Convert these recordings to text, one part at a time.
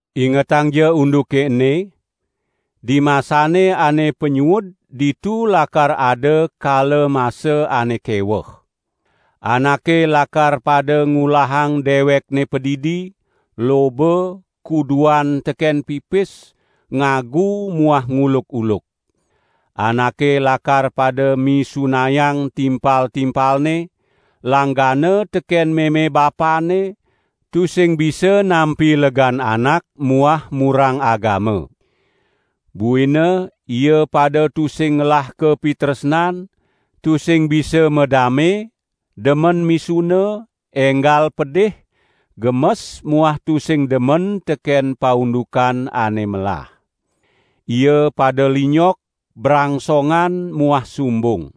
Ingetangja unduke ene. Dimasane ane panyuud ditu lakar ada kala masa ane keweh. Anake lakar pada ngulahang dewekne padidi, loba, kuduan teken pipis, ngagu muah nguluk-uluk. Anake lakar pada misunayang timpal-timpalne, langgana teken meme bapanne, tusing bisa nampi legan anak muah murang agama. Buina ia pada tusing ngelah kapitresnan, tusing bisa madame, demen misuna, enggal pedih, gemes muah tusing demen teken paundukan ane melah. Ia pada linyok, brangsongan muah sumbung.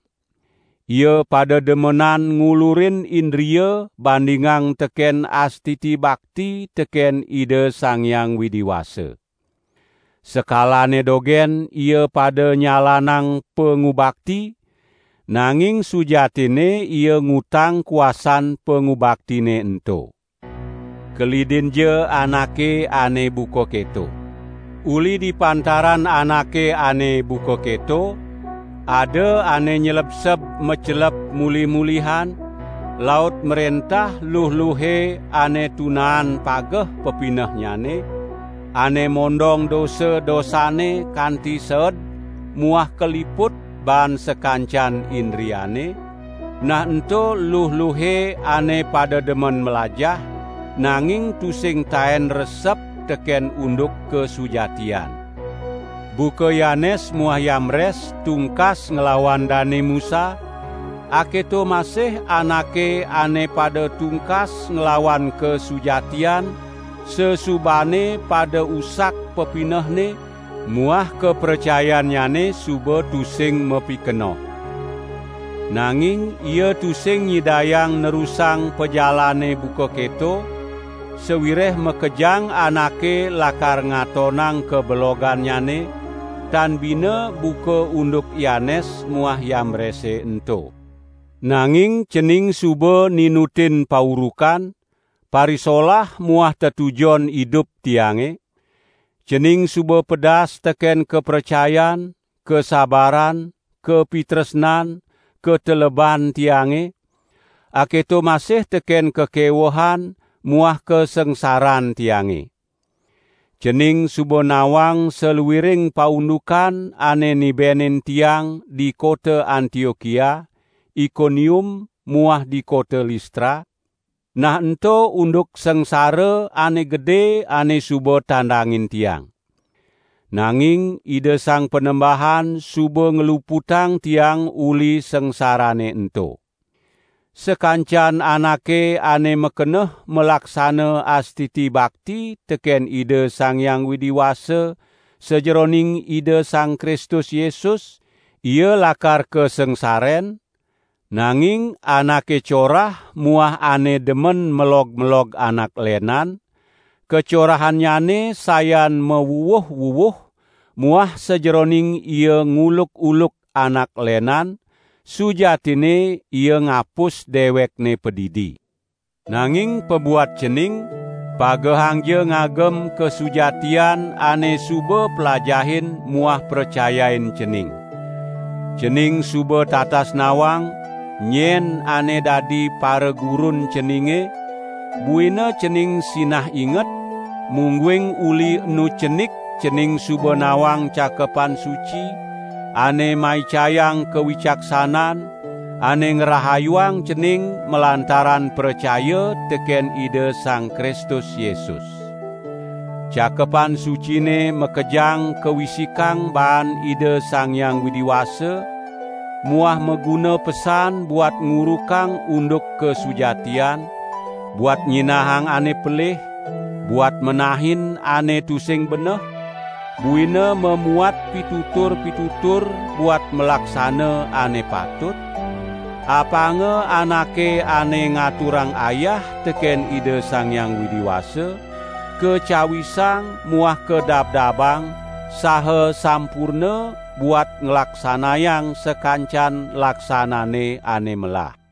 Ia pada demenan ngulurin indria bandingang teken astiti bakti teken Ida Sang Hyang Widi Wasa. Sekalane dogen ia pada nyalanang pangubakti, nanging sujatinne ia ngutang kuasan pangubaktine ento. Kelidinja anake ane buka keto. Uli di pantaran anake ane buka keto, ada ane nylebseb macelep mulih-mulihan, laut mrentah luh-luhe ane tunaan pageh pepinehnyane, ane mondong dosa-dosanne kanti seed muah kaliput baan sakancan indriane, nah ento luh-luhe ane pada demen mlajah, nanging tusing taen resep teken unduk kasujatian. Buka Yanes muah Yambres tungkas nglawan Dane Musa, aketo masih anake ane pada tungkas nglawan kasujatian sasubane pada usak pepinehne muah kapracayannyane suba tusing mapikenoh. Nanging ia tusing nyidayang nerusang pajalanne buka keto, sawireh makejang anake lakar ngatonang kabelogannyane, tan bina buka unduk Yanes muah Yambrese ento. Nanging cening suba ninutin paurukan, parisolah muah tetujon idup tiange; cening suba pedas teken kapracayan, kasabaran, kapitresnan, kateleban tiange, aketo masih teken kakewehan muah kasangsaran tiange. Cening suba nawang saluiring paundukan ane nibenin tiang di kota Antiokia, Ikonium muah di kota Listra, nah ento unduk sangsara ane gede ane suba tandangin tiang. Nanging Ida Sang Panembahan suba ngluputang tiang uli sangsarane ento. Sakancan anake ane makeneh malaksana astiti bakti teken Ida Sang Hyang Widi Wasa sajeroning Ida Sang Kristus Yesus, ia lakar kasangsaren, nanging anake corah muah ane demen melog-melog anak lenan, kacorahannyane sayan mawuwuh-wuwuh muah sajeroning ia nguluk-uluk anak lenan, sujatinne ia ngapus dewekne padidi. Nanging pabuat cening, pagehangja ngagem kasujatian ane suba plajahin muah pracayain cening. Cening suba tatas nawang, nyen ane dadi paragurun ceninge, buina cening sinah inget, mungguing uli enu cenik cening suba nawang Cakepan Suci, ane maicayang kawicaksanan, ane ngrahayuang cening malantaran pracaya teken Ida Sang Kristus Yesus. Cakepan Sucine makejang kawisikang baan Ida Sang Hyang Widi Wasa muah maguna pesan buat ngurukang unduk kasujatian, buat nyinahang ane pelih, buat menahin ane tusing beneh, buina mamuat pitutur-pitutur buat malaksana ane patut, apanga anake ane ngaturang ayah teken Ida Sang Hyang Widi Wasa, kacawisang muah kadabdabang saha sampurna buat nglaksanayang sakancan laksanane ane melah.